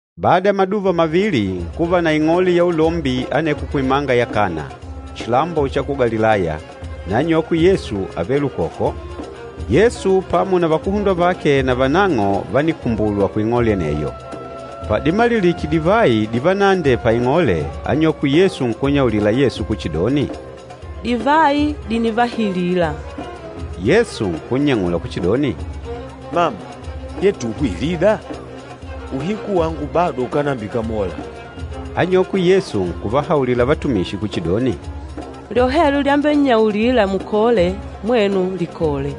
Bada ya maduva mavili, nkuva na ing'ole ya ulombi aneko kuimanga ya Kana, chilambo cha ku Galilaya, na anyokwe Yesu ávele ukoko. Yesu pamo na vakuhundwa vake navanang'o vánikumbulwa kuing'ole aneyo. Padimalilike divayi divanaandee paing'ole, anyokwe Yesu nkunnyaulila Yesu kuchidoni, “Divayi dìnivahilila.” Yesu nkunnyang'ula kuchidoni, “Mama, yetuhwe ilida? Uhiku wangu bado ukánambikamola.” Anyokwe Yesu nkuvahaulila vatumishi kuchidoni, “Lyohelyo lyambennyaulila mukole, mwenu likole.”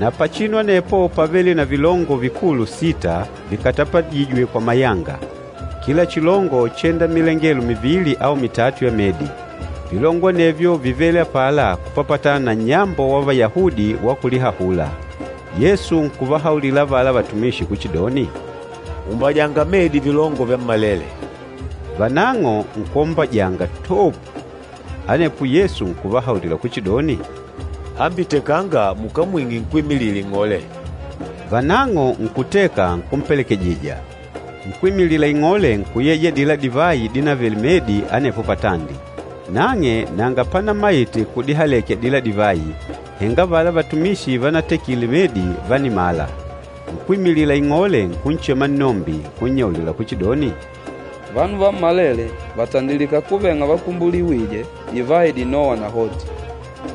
Na pachinu anepo pávele na vilongo vikulu sita vikatapajîjwe kwa mayanga, kila chilongo chénda milengelo mivili au mitatu ya medi. Vilongo anevyo vívele apala kupapatana na nnyambo wa Vayahudi wa kulihahula. Yesu nkuvahaulila avala vatumishi kuchidoni, “Umbajanga medi vilongo vyammalele.” Vanang'o nkwombajanga, toopu. Anepo Yesu nkuvahaulila kuchidoni, “Hambi tekanga mukamwing'e nkwímilila ing'ole.” Vanang'o nkuteka, nkumpelekejija. Nkwímilila ing'ole nkuyeja adila divayi dínavele medi anepo patandi. Nang'e nanga panamaite kudihaleke adila divayi, henga avala vatumishi vanatekile medi vánimala. Nkwímilila ing'ole nkunchema nnombi, nkunnyaulila kuchidoni, “Vanu vammalele vàtandilika kuveng'a vakumbuliwîje divayi dinôwa nahoti,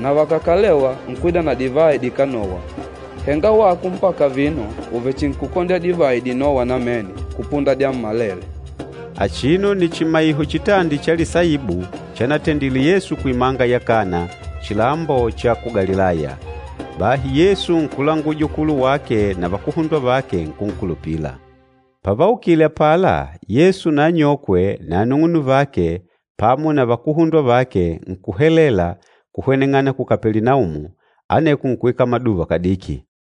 na vakàkalewa nkwida na divayi dikánowa. Henga wako mpaka vino uvechinkukondya divayi dinôwa namene kupunda dyammalele.” Achino nni chimaiho chitandi cha lisaibu, chanatendile Yesu kuimanga ya Kana, chilambo cha ku Galilaya. Bahi Yesu nkulanguja ukulu wake na vakuhundwa vake nkunkulupila. Pavaukile apala, Yesu na anyokwe na anung'unuvake pamo na vakuhundwa vake nkuhelela kuhweneng'ana ku Kapelinaumu, aneko nkuikala maduva kadiki.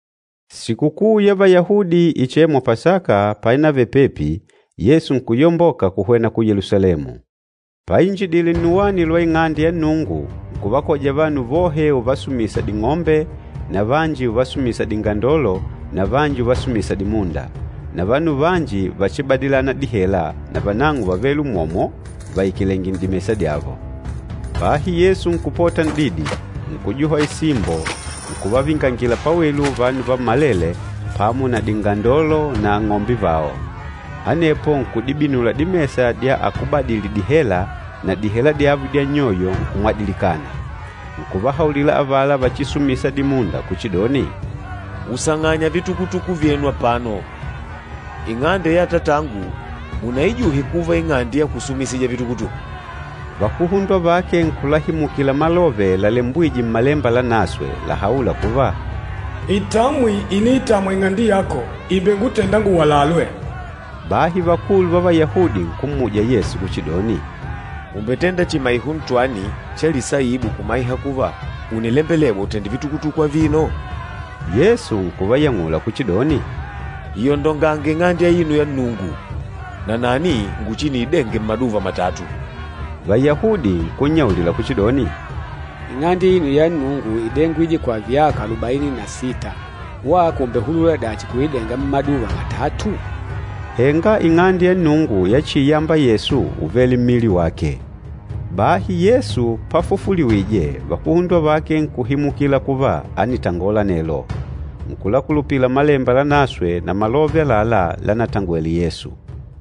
Sikukuu ya Vayahudi ichêmwa Pasaka painavele pepi, Yesu nkuyamboka kuhwena ku Yelusalemu. Painjidile nnuwani lwa Ing'ande ya Nnungu, nkuvakoja vanu vohe uvasumisa ding'ombe, na vanji uvasumisa dingandolo na vanji uvasumisa dimunda. Na vanu vanji vachibadilana dihela navanang'o vávele umwomwo vaikalèngè n'dimesa dyavo. Bahi Yesu nkupota n'didi, nkujuha isimbo nkuvavingangila pawelu vanu vammalele pamo na dingandolo na ang'ombe vao. Anepo nkudibinula dimesa dya akúbadili dihela na dihela dyavo dya nnyoyo nkumwadilikana. Nkuvahaulila avala vachisumisa dimunda kuchidoni, “Usang'anya vitukutuku vyenu apano. Ing'ande ya Atatangu munaijuhe kuva ing'ande ya kusumisija vitukutuku!” Vakuhundwa vake nkulahimukila malove lalembwîje Mmalemba Lanaswe làhaula kuva, “Itamwi iniitamwa ing'ande yako ìmbengutenda nguwalalwe.” Bahi vakulu va Vayahudi nkummuja Yesu kuchidoni, “Ùmbetenda chimaiho ntwani cha lisaibu kumaiha kuva ùnilembelewa utenda vitukutuku avino?” Yesu nkuvayang'ula kuchidoni, “Iyondongange Ing'ande aino ya Nnungu, nanani nguchiniidenge mmaduva matatu.” Vayahudi nkunnyaulila kuchidoni, “Ing'ande aino ya Nnungu ídengwile kwa vyaka alubaini na sita. Wako ùmbehulula dachi kuidenga mmaduva matatu?” Henga Ing'ande ya Nnungu yachiiyamba Yesu úvele mmili wake. Bahi Yesu pafufuliwije, vakuhundwa vake nkuhimukila kuva ánitangola anelo. Nkulakulupila Malemba Lanaswe na malove àlalá lanatangwele Yesu.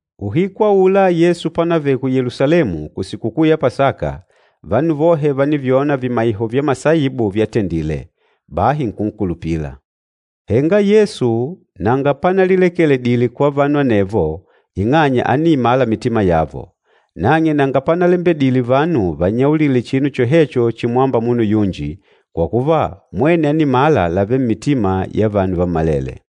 Uhiku aula Yesu pánavele ku Yelusalemu kusikukuu ya Pasaka, vanu vohe vánivyona vimaiho vya masaibu vyatendile, bahi nkunkulupila. Henga Yesu nanga panalilekeledile kwa vanu anevo ing'anya ániimala mitima yavo. Nang'e nanga panalembedile vanu vannyaulile chinu chohecho chimwâmba munu yunji, kwa kuva mwene ánimala lavêle mmitima ya vanu vammalele.